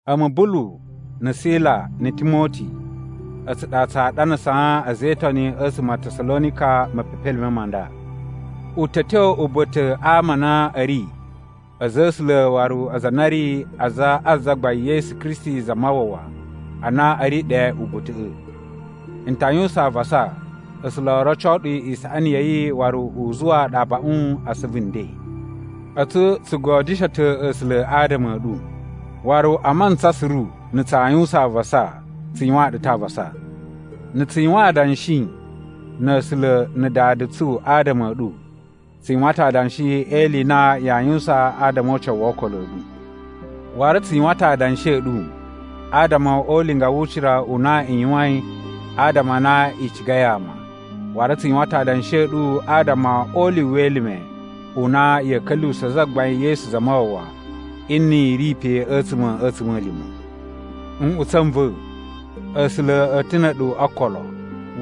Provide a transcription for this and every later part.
A̱mu Bulu, na̱ Sila na̱ Timoti, a̱tsu ɗa tsaa ɗanasaa a̱za̱ e Itoni a̱tsuma̱ a Tasalonika mepepelime ma nda. U ta̱ a̱ tyo uba̱ta̱ a ama a na a̱ ri a̱za̱ a̱ A̱sula̱ waru aza a na a̱ ri aza a Zagbain Yesu Kristi Zamawawa a na a̱ ri ɗe uba̱ta̱ꞌa̱. N ta yuwusan avasa A̱sula̱ o roco ɗu isaꞌani ya̱ yi waru u zuwaa ɗu abaꞌun a asuvu nden! A̱tsu tsu godyusho ta̱ A̱sula̱ adama a̱ ɗu. Waru a mantsa suru na̱ tsaa yuwusan avasa, tsu yuwaan ɗu ta̱ avasa. Na̱ tsu yuwan adanshi na̱ A̱sula̱ na̱ Dada tsu adama a̱ ɗu, tsu yuwan ta̱ adanshi e ili i na yaa yuwusan adama o ucawu wo okolo a̱ ɗu. Waru tsu yuwan ta̱ adanshi a̱ ɗu adama o ulinga wu ucira u na i yuwain adama a na i cigai ama. Waru tsu yuwan ta̱ adanshi a̱ ɗu adama o ulyuwu we elime u na ya̱a̱ ka̱lyuwusa̱ Zagbain Yesu Zamawawa nni i ri pe a̱tsuma̱ a̱ a̱tsuma̱lima̱. Nꞌutsa̱ n va̱, A̱sula̱ a̱ ta̱ na̱ a̱ɗu o okolo,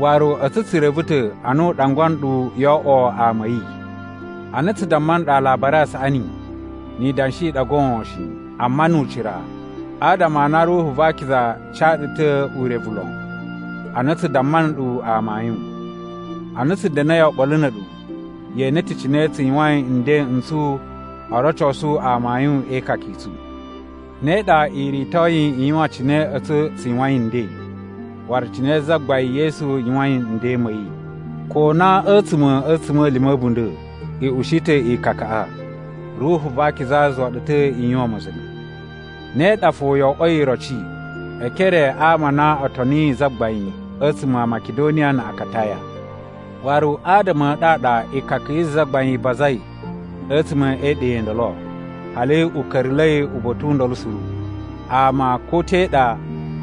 waru a̱tsu tsu reve ta̱ a na u ɗangwa nɗu yo oꞌwo ama a̱ yi. Ana tsu damma nɗu Alabari a Saꞌani, ni idanshi i ɗa goon shi, amma nu ucira, adama a na Ruhu va Akiza ca ɗu ta̱ urevu lon ana tsu damma nɗu amayun. Ana tsu da̱na̱i oɓolo na̱ a̱ɗu, ye ene ta̱ cine tsu yuwain nden n tsu o rocosu amayun e ikaka i tsu. Ne ɗa i ritoi i yuwan cine a̱tsu tsu yuwain nden, waru cine Zagbain Yesu yuwain nden ma̱ yi. Ko na a̱tsuma̱ a̱ a̱tsuma̱lima̱ a̱ a̱bunda̱ i ushi ta̱ ikakaꞌa, Ruhu va Akiza zuwa ɗu ta̱ i yuwan ma̱za̱nga̱. Ne ɗa fo yo oꞌwoi iroci e ekere a ama a na o toniyi Zagbain a̱tsuma̱ a Makidoniya na̱ Akataya. Waru adama a̱ ɗu a ɗa ikaka yi Zagbain i bazai a̱tsuma̱ e iɗa i ndolo, hali u ka̱ra̱la̱i uba̱ta̱ u ndolo suru. Ama ko te ɗa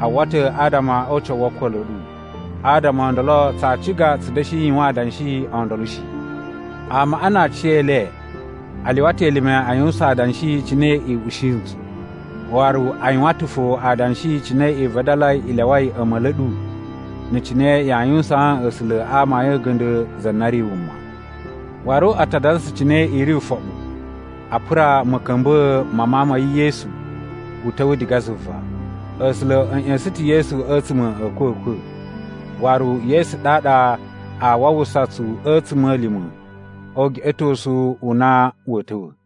a uwwa ta̱ adama o ucawu wo okolo a̱ ɗu. Adama o ndolo tsaa ciga tsu da̱shi yuwan adanshi o ndolo shi. Amaꞌa na aciyele a lyuwa ta̱ elime a yuwusan adanshi cine i ushi ntsu. Waru a yuwan ta̱ fo adanshi cine i vadalai i lyawai a̱ma̱li a̱ ɗu na̱ cine yaa yuwusaan A̱sula̱ a amayun a̱ga̱nda̱ za na ri wuma. Waru a ta dansa cine i ri ufoɓu a pura ma̱ka̱mba̱a̱ ma Mawun ma̱ yi Yesu u ta̱wa̱ diga zuva. A̱sula̱ a̱ ꞌya̱sa̱n ta̱ Yesu a̱tsuma̱ a̱ a̱kwa̱kwa̱, waru Yesu ɗaɗa aa wawusa tsu a̱tsuma̱lima̱ o ugeꞌetosu u na wa̱a̱ ta̱wa̱.